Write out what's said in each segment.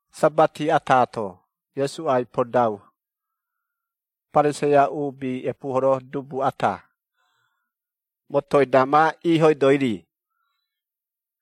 Sabati ata-to, Iesu ai-podau Pariseia uubi epuuhoro dubu ata, motoi-da ma iihoidoi-ri,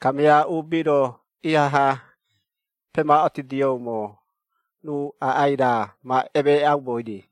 kamia uubi-ro ihaha pemaꞌotidioumo, ruu aꞌai raa ma emeeꞌaumoi-ri.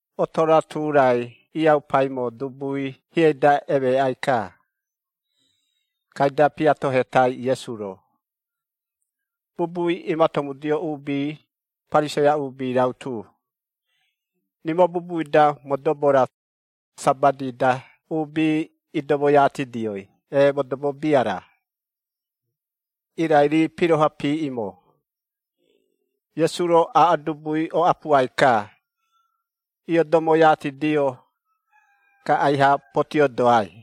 Oto-ra tu-rai iaupaimo dubui hieꞌei-da emeeꞌai-ka. Kaida piatohetai Iesu-ro, bubui imatomudioumo uubi, Pariseia uubi rautu, “Rimo bubui-da modobo-ra, Sabati-da uubi idomoiatidioi, ee modobo bia-ra?” Irai rii piroha piiꞌimo. Iesu-ro aaꞌo dubui, oꞌapuai-ka, iodomoiatidio, ka aiha potiodoai.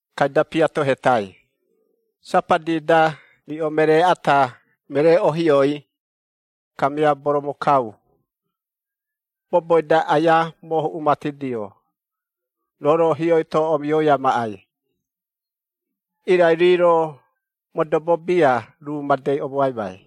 Kaida piatohetai, “Sabati-da riꞌo meree ata meree ohioi, kamia boromokau, boboi-da aia moohuꞌumatidio, roo-ro hioi-to omioi amaꞌai?” Irai rii-ro, modobo bia ruu madei omoaimai.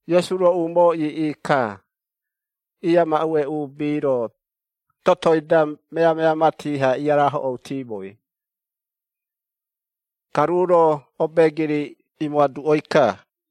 Iesu-ro umoo iiꞌi-ka, iiamaꞌue uubi-ro totoi-da meamea mati-ha iarahoꞌoutimoi, ka ruu-ro obeegiri imoaduꞌoi-ka.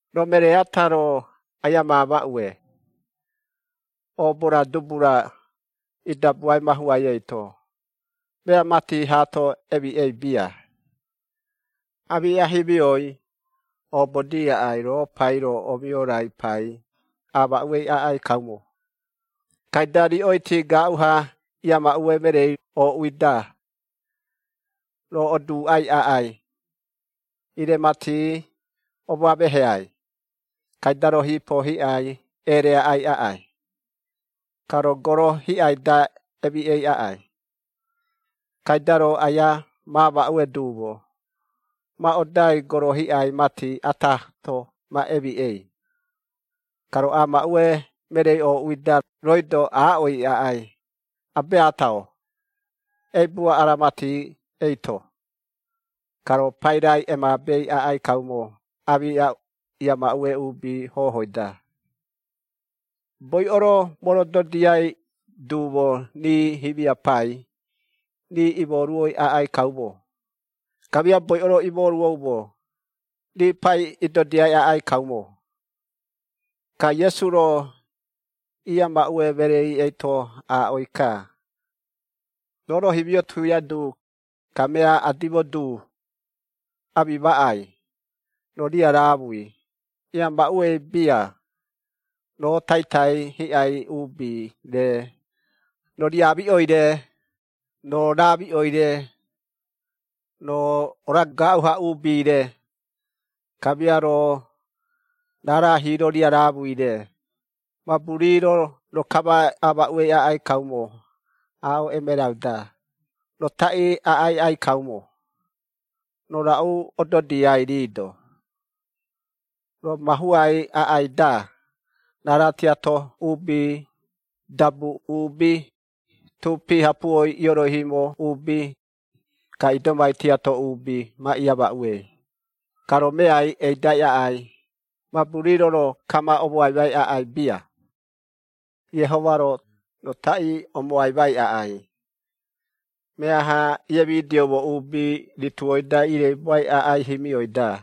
“Roo meree ata-ro aia maamaꞌue, oobo-ra dubu-ra idabuai mahuai eito, mea mati haato emiꞌei bia. Aamiꞌa himioi, oobodii aꞌai roo pai-ro omiorai pai, aamaꞌuei aꞌai kaumo, kaida riꞌoiti gaaꞌu-ha iamaꞌue mereei ooꞌui-da, roo oduuꞌai aꞌai, ‘Ire mati omoameheai.’ Kaida roo hiipo hiꞌai ereaꞌai aꞌai, ka roo goro hiꞌai-da emiꞌei aꞌai. Kaida roo aia maamaꞌue duumo ma odai goro hiꞌai mati ataato ma emiꞌei, ka roo aamaꞌue mereei ooꞌui-da rooi-do aaꞌoi aꞌai, ‘Abeata-o, eibua ara mati eito.’ Ka roo pairai emaabei aꞌai kaumo aamiꞌa iiamaꞌue uubi hohoi-da. Boiꞌo-ro morododiai duumo rii himia pai, rii iimoruoi aꞌai kaumo, kamia boiꞌo-ro iimoruoumo, rii pai idodiai aꞌai kaumo.” Ka Iesu-ro iiamaꞌue mereei eito aaꞌoi-ka, “Roo-ro himio tuia du, kamia adimo du, amimaꞌai, roo riaraamui iamaꞌuei bia, roo taitai hiꞌai uubi-re, roo riamiꞌoi-re, roo raamiꞌoi-re, roo ora-gaaꞌu-ha uubi-re, kamia roo raara hiiro riaraamui-re, mabu rii-ro roo kama aamaꞌuei aꞌai kaumo, aaꞌo emerau-da, roo taꞌii aꞌai aꞌai kaumo, roo raꞌu ododiai rii-do. Roo mahuai aꞌai-da, raara tiato uubi, dabu uubi, tuupi hapuoi ioroihiimo uubi, ka idomai tiato uubi ma iamaꞌuei, ka roo meai eidai aꞌai, mabu rii-ro roo kama omoaimai aꞌai bia. Iehoma-ro, roo taꞌii omoaimai aꞌai, meaha iemidioumo uubi rituoi-da ireibuai aꞌai himioi-da.”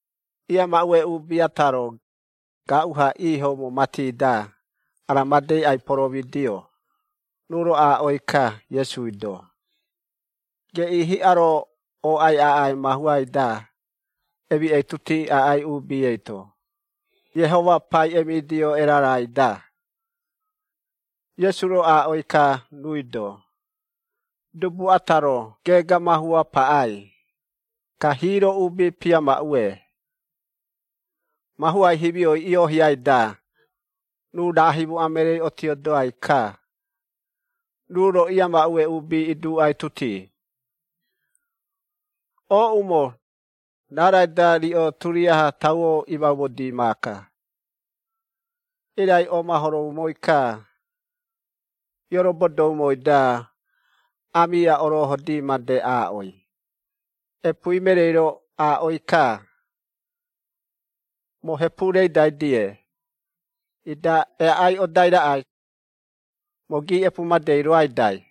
Iiamaꞌue uubi ata-ro, gaaꞌu-ha iihoumo mati-da, ara madei ai-poromidio, ruu-ro aaꞌoi-ka Iesui-do, “Geꞌii hiꞌa-ro ooꞌai aꞌai mahuai-da emiꞌeituti aꞌai uubi eito, Iehoma pai emidio erarai-da!” Iesu-ro aaꞌoi-ka ruui-do, “Dubu ata-ro geega mahua paꞌai, ka hiiro uubi piamaꞌue. Mahuai himioi iohiai-da, ruu raa himoꞌa mereei otiodai-ka, ruu-ro iiamaꞌue uubi iduꞌaituti, ‘Ooꞌumo, raarai-da riꞌo turiaha tauo imaumodii maaka.’ Irai omahoroumoi-ka, iiorobodoumoi-da, aamiꞌa orohodi made aaꞌoi, epuui mereei-ro aaꞌoi-ka, ‘Moo hepu reidai-die, ida eaꞌai odai raꞌai, moo giiꞌepu madei roaidai.’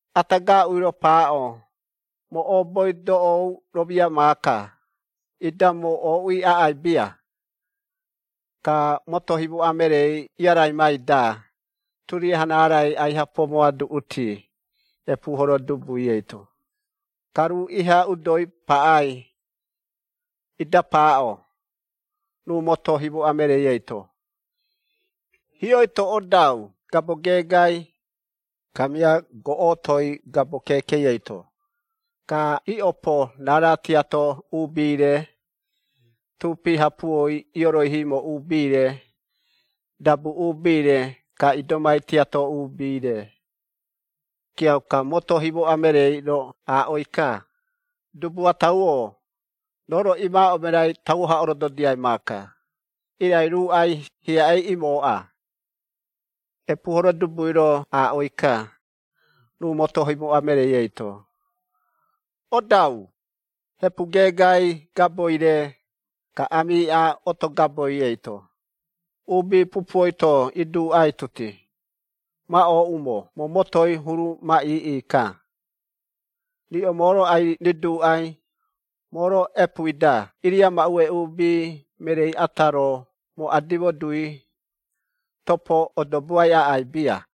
Ata gaaꞌui-ro paaꞌo, ‘Moo ooboi doꞌou romia maaka, ida moo ooꞌui aꞌai bia.’ “Ka moto himoꞌa mereei iaraimai-da, turiaha raarai aiha pomoaduꞌuti epuuhoro dubui eito, ka ruu iha udoi paꞌai, ida paaꞌo, ruu moto himoꞌa mereei eito, ‘Hioi-to odau gabo geegai, kamia goꞌotoi gabo keekei eito, ka iꞌopo raara tiato uubi-re, tuupi hapuoi ioroihiimo uubi-re, dabu uubi-re, ka idomai iaꞌa tiato uubi-re.’ Kiauka, moto himoꞌa mereei-ro aaꞌoi-ka, ‘Dubu atau-o, roo-ro imaaꞌo emerai tauo-ha orododiai maaka, irai ruuꞌai hiaꞌei imooꞌa.’ Epuuhoro dubui-ro aaꞌoi-ka, ruu moto himoꞌa mereei eito, ‘Odau, hepu geegai gaboi-re, ka aamiꞌa oto gaboi eito, uubi pupuoi-to iduꞌaituti, ma ooꞌumo moo motoi huru ma iiꞌi-ka. Riꞌo moo-ro ai-riduuꞌai, moo-ro epuui-da iiriamaꞌue uubi mereei ata-ro moo adimo dui, topo odoboai aꞌai bia.’”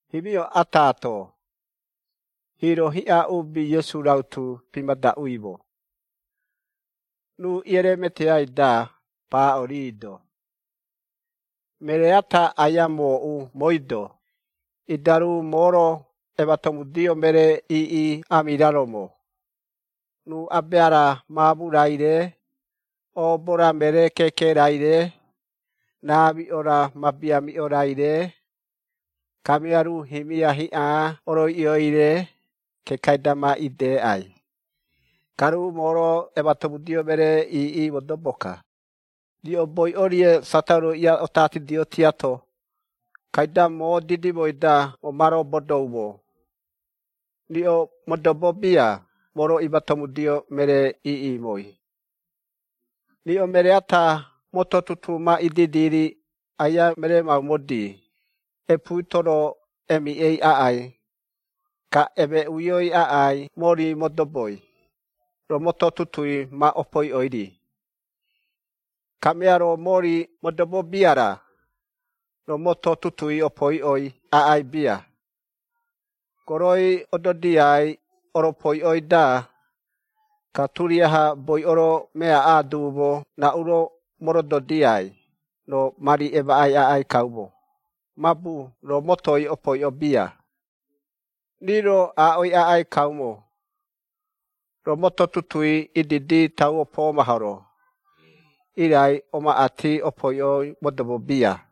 Himio ataato, hiiro hiꞌa uubi Iesu rautu pimadaꞌuimo, ruu iereemeteai-da paaꞌo rii-do, “Meree ata aia mooꞌu mooi-do, ida ruu moo-ro ematomudio meree iiꞌi amiraromo, ruu abea-ra maamu-raire, oobo-ra meree keeke-raire, raamiꞌo-ra mabiamiꞌo-raire, kamia ruu himia hiꞌa oroiꞌioi-re, kekai-da ma ideꞌai, ka ruu moo-ro ematomudio meree iiꞌi modobo-ka. Riꞌo boiꞌo-rie satauroi iaꞌotatidio tiato, kaida moo didimoi-da moo ma robodoumo, riꞌo modobo bia moo-ro imatomudio meree iiꞌimoi. “Riꞌo meree ata moto tutuu ma ididi-ri aia meremaumodi, epuui-to roo emiꞌei aꞌai, ka emeꞌuioi aꞌai mori modoboi, roo moto tutuui ma opoiꞌoi-ri. Kamia roo mori modobo bia-ra, roo moto tutuui opoiꞌoi aꞌai bia, goroi ododiai oropoiꞌoi-da, ka turiaha boiꞌo-ro meaꞌa duumo raꞌu-ro morododiai, roo mari emaꞌai aꞌai kaumo, mabu roo motoi opoiꞌo bia. Rii-ro aaꞌoi aꞌai kaumo, ‘Roo moto tutuui ididi tauo poomahoro, irai omaꞌati opoiꞌoi modobo bia.’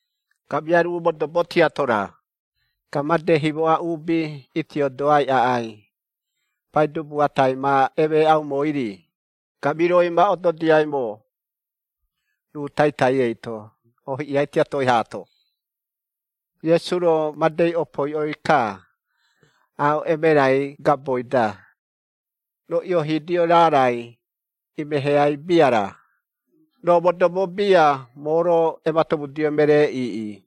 Kamia ruu modobo tiato-ra, ka made himoꞌa uubi itiodoai aꞌai, paidubu atai ma emeeꞌaumoi-ri, ka miroi ma ododiaimo ruu taitai eito oohiꞌia tiatoi haato.” Iesu-ro madei opoiꞌoi-ka, “Aaꞌo emerai gaboi-da, roo ioohiidio raarai imeheai bia-ra, roo modobo bia moo-ro ematomudio meree iiꞌi.”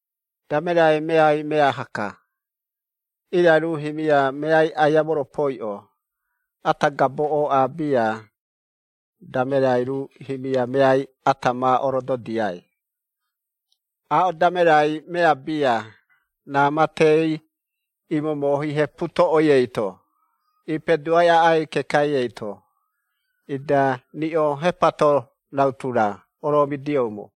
“Damerai meai meaha-ka, irai ruu himia meai aia moropoiꞌo, ata gabo ooꞌa bia, damerai ruu himia meai ata ma orododiai. Aaꞌo damerai mea bia, raa matei imomohi hepu toꞌoi eito, iipeduai aꞌai kekai eito. Ida riꞌo hepato rautu-ra oromidioumo.”